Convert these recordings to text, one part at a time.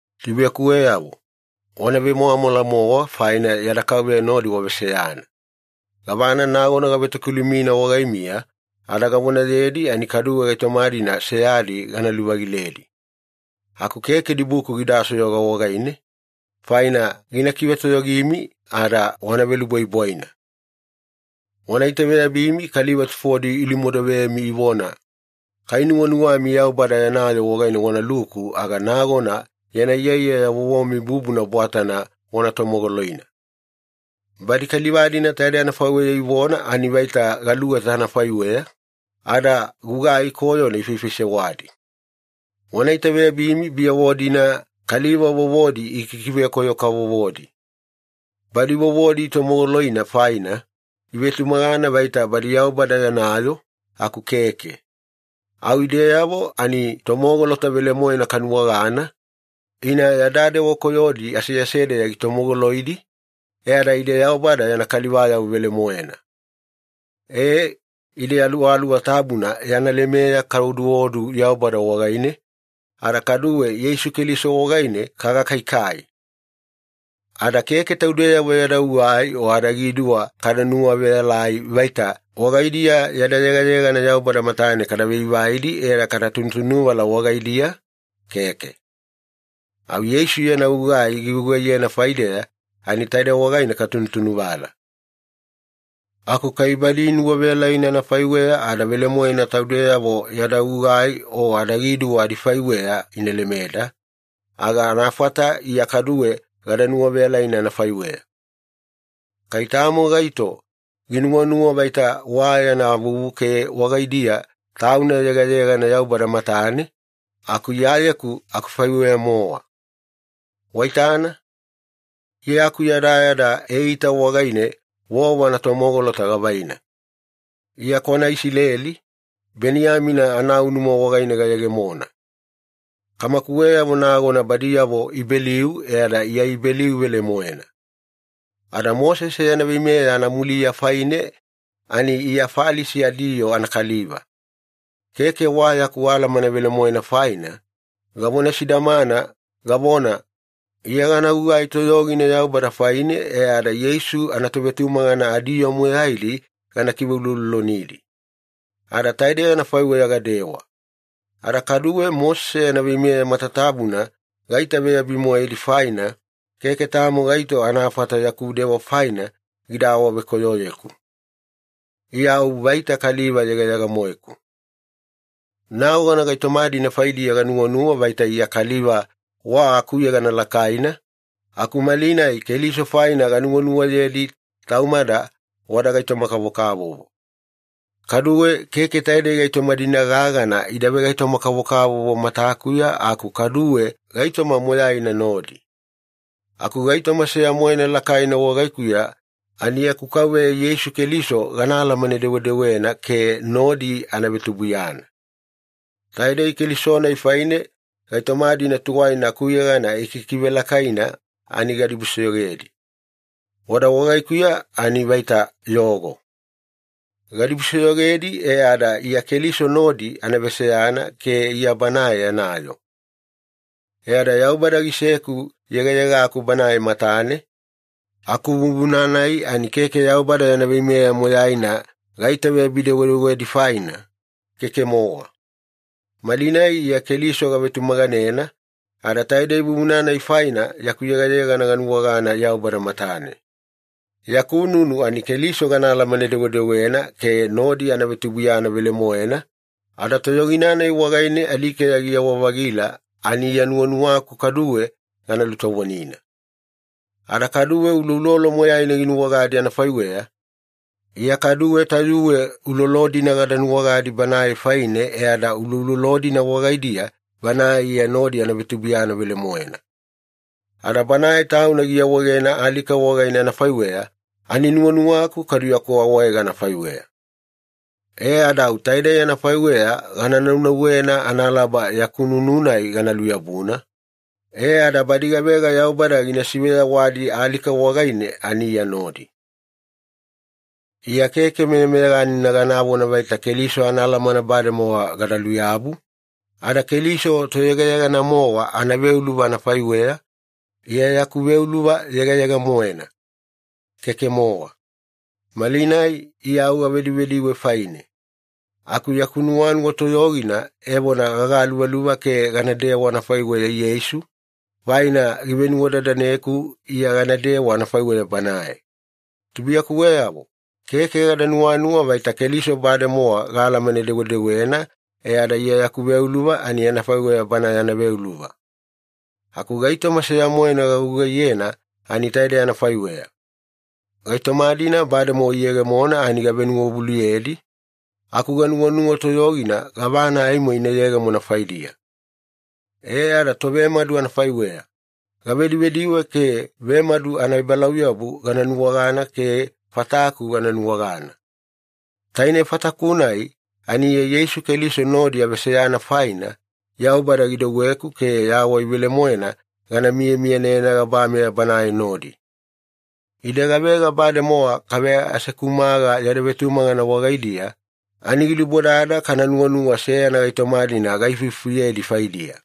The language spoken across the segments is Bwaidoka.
Tubuiyakuweyavo, wana vemwamwala-mowa faina yada Kauveya nodi waveseyana. Gavana nagona gavetokilumina wagaimiya ada gavonayedi ani kaduwe gaitoma-dina seyadi gana luvagiledi. Aku keke dibuku gida soyoga wagaine, faina gina kivetoyogimi ada wana velubwaibwaina. Wana itaveyabimi kaliva tufodi ilumodovemi ivona, “Kai nuwanuwami Yaubada yana yoo wagaine wanaluku, aga nagona yana iyaiyaya vovomi bubuna bwatana wana tomogoloina.” Badi kaliva-dina taidei anafaiweya ivona ani vaita galuweta anafaiweya, ada gugai koyona ifaifaisewadi. Wana itaveyabimi biyavo-dina, kaliva vovodi ikikivekoyo-kavovodi. Badi vovodi itomogoloina faina, ivetumagana vaita badi Yaubada yana yoo, aku keke. Au ideyavo ani tomogolota velemoena kanuwagana, ina yada dewa koyodi aseasedeya gitomogoloidi, e ada ide Yaubada yana kalivayavo velemoena. E, ide Aluwaluwa Tabuna yana lemeya kaoduodu Yaubada wagaine, ada kaduwe Yeisu Keliso wagaine kagakaikai. Ada keke taudeyavo yada gugai o adagiduwa kada nuwaveyalai vaita wagaidiya yada yegayegana Yaubada matane kavaivaidi e ada katunutunuvala wagaidiya, keke. Au Yeisu yana gugai gigugaiyena faideya ani taide wagaine katunutunuvala. Aku kai badi inuwaveyalaina anafaiweya ada velemoena taudeyavo yada gugai o adagiduwa adifaiweya ina lemeda, aga anafata Iya kaduwe gada nuwaveyalaina anafaiweya. Kai tamo gaito ginuwanuwa vaita wa yana vuvu ke wagaidiya tauna yegayegana Yaubada matane, aku Iyayeku akufaiweya-mowa. Waitana, Iya akuyadayada eita wagaine vovo anatomogolota gavaina. Iya kwana Isileli, Beniyamina anaunuma wagaine gayegemona. Kamakuweyavo nagona badiyavo Ibeliu e ada Iya Ibeliu velemoena. Ada Mosese yana veimeya anamuliya faine ani Iya Falisi adiyoo anakaliva. Keke wa yaku alamana velemoena faina, gavona sidamana, gavona, “Iya gana gugai toyogina Yaubada faine e ada Yeisu anatovetumagana adiyoo moyaidi gana kiveuloulolonidi.” Ada taidei anafaiweya gadewa. Ada kaduwe Mosese yana veimeya matatabuna gaitaveyabi-moedi faina, keke tamo gaito anafata yaku dewa faina gida awavekoyoyeku. Iya au vaita kaliva yegayega-moeku. Nagona gaitoma-dina faidiya ganuwanuwa vaita Iya kaliva wa akuyegana lakaina, aku malinai Keliso faina ganuwanuwayedi taumada wada gaitoma-kavokavovo. Kaduwe keke taidei gaitoma-dina gagana ida vegaitoma-kavokavovo matakuya aku kaduwe gaitoma moyaina nodi. Aku gaitoma seya-moena lakaina wagaikuya ani yaku Kauveya Yeisu Keliso gana alamane-dewedewena ke nodi ana vetubuiyana. Taidei Keliso-nai faine gaitoma-dina tuwaina akuyegana ikikivelakaina ani gadibusoyogedi. Wada wagaikuya ani vaita yogo. Gadibusoyogedi e ada Iya Keliso nodi ana veseyana ke Iya Banae yana yoo. E ada Yaubada giseku yegayegaku Banae matane, aku vuvuna-nai ani keke Yaubada yana veimeya moyaina gaitaveyabi-dewedewedi faina, keke-mowa. Malinai Iya Keliso gavetumaganena, ada taidei vuvuna-nai faina yaku yegayegana ganuwagana Yaubada matane. Yaku nunu ani Keliso gana alamane-dewedewena ke nodi ana vetubuiyana velemoena, ada toyogina-nai wagaine alikeya giyawa-vagila ani Iya nuwanuwaku kaduwe gana lutovonina. Ada kaduwe uloulolo moyaina ginuwagadi anafaiweya, Iya kaduwe tayuwe ulolo-dina gada nuwagadi Banae faine e ada uloulolo-dina wagaidiya Banae Iya nodi ana vetubuiyana velemoena. Ada Banae Tauna giawaegena alika wagaine anafaiweya, ani nuwanuwaku kadu yaku awaega anafaiweya. E ada au taidei anafaiweya gana naunauwena analaba yaku nunu-nai gana luyabuna, e ada badi gavega Yaubada gina siveyawadi alika wagaine ani Iya nodi. Iya keke meyameyaganina ganavona vaita Keliso anaalamana bademowa gada luyabu, ada Keliso Toyegayegana-mowa anaveuluva anafaiweya, Iya yaku veuluva yegayega-moena. Keke-mowa. Malinai Iya au gavedivediwe faine. Aku yaku nuwanuwa toyogina evona gagaluvaluva ke ganadewa anafaiweya Yeisu, faina givenuwadadaneku Iya ganadewa anafaiweya Banae. Tubuiyakuweyavo, keke gada nuwanuwa vaita Keliso bademowa gaalamane-dewedewena e ada Iya yaku veuluva ani anafaiweya Bana yana veuluva. Aku gaitoma seya-moena gagugaiyena ani taidei anafaiweya. Gaitoma-dina bademowa iyegemona ani gavenuwavuluyedi, aku ganuwanuwa toyogina gavana aimo ina yegemona faidiya. E ada tovemadu anafaiweya, gavedivediwe ke vemadu anaebalauyabu gana nuwagana ke fataku gana nuwagana. Taine fataku-nai ani Iya Yeisu Keliso nodi aveseyana faina, Yaubada gidouweku ke yawai velemoena gana miyamiyanena gabameya Banae nodi. Ide gavega bademowa kaveasekumaga yada vetumagana wagaidiya, ani gilubodada kana nuwanuwa seyana gaitoma-dina gaifufuyedi faidiya.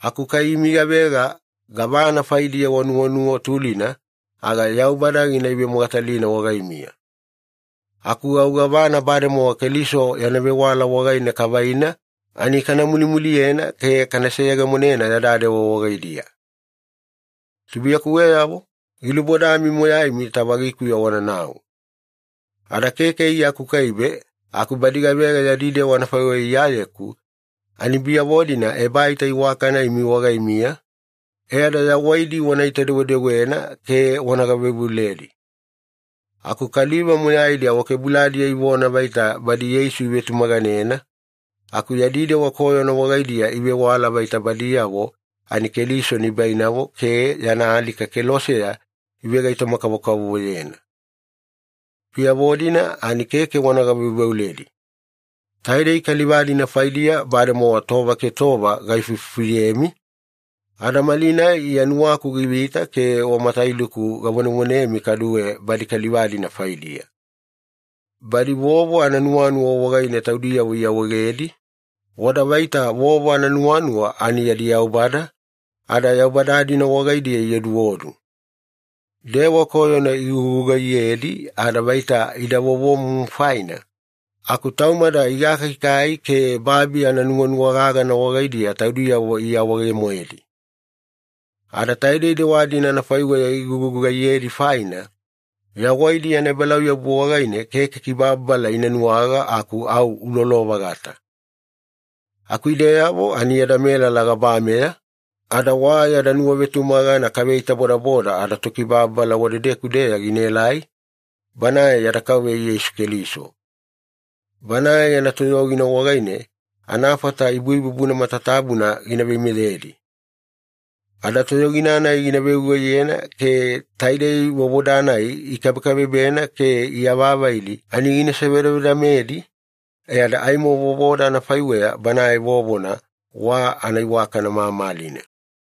Aku kai imi gavega gavana faidiya wanuwanuwa tulina, aga Yaubada gina ivemogatalina wagaimiya. Aku au gavana bademowa Keliso yana vewala wagaine kavaina ani kana mulimuliyena ke kana seyegemonena yada dewa wagaidiya. Tubuiyakuweyavo, gilubodami moyaimi tavagikuya wananau. Ada keke Iya akukaibe aku badi gavega yadi dewa anafaiweya Iyayeku, ani biyavo-dina ebaita iwakana imi wagaimiya, e ada yawaidi wanaita-dewedewena ke wana gaveuveuledi. Aku kaliva moyaidi awakebuladiya ivona vaita badi Yeisu ivetumaganena, aku yadi dewa koyona wagaidiya ivewala vaita badiyavo ani Keliso nibainavo ke yana alika keloseya ivegaitoma-kavokavovoyena. Biyavo-dina ani keke wana gaveuveuledi. Taidei kaliva-dina faidiya bademowa tova ke tova gaifufuyemi, ada malinai Iya nuwaku givita ke wa matailuku gavonevonemi kaduwe badi kaliva-dina faidiya. Badi vovo ananuwanuwa wagaine taudiyavo iawaegedi, wada vaita vovo ananuwanuwa ani yadi yaubada, ada yaubada-dina wagaidiya ioduodu. Dewa koyona igugugaiyedi ada vaita ida vovomumu faina, aku taumada igakaikai ke babi ananuwanuwa gagana wagaidiya taudiyavo iawaege-moedi. Ada taidei dewa-dina anafaiweya igugugaiyedi faina, yawaidi anaebalauyabu wagaine keke kibababala ina nuwaga aku au ulolo-vagata. Aku ideyavo ani yada melala gabameya, ada wa yada nuwavetumagana kaveitabodaboda adaTokibababala wadedeku-deya ginaelai, Banae yada Kauveya Yeisu Keliso. Banae yana toyogina wagaine anafata ibuibubuna matatabuna gina veimeyedi. Ada toyogina-nai gina vegugaiyena ke taidei vovoda-nai ikabekabebena ke iavavaidi ani gina sivedavedamedi, e ada aimo vovoda anafaiweya Banae vovona wa anaiwakana mamalina.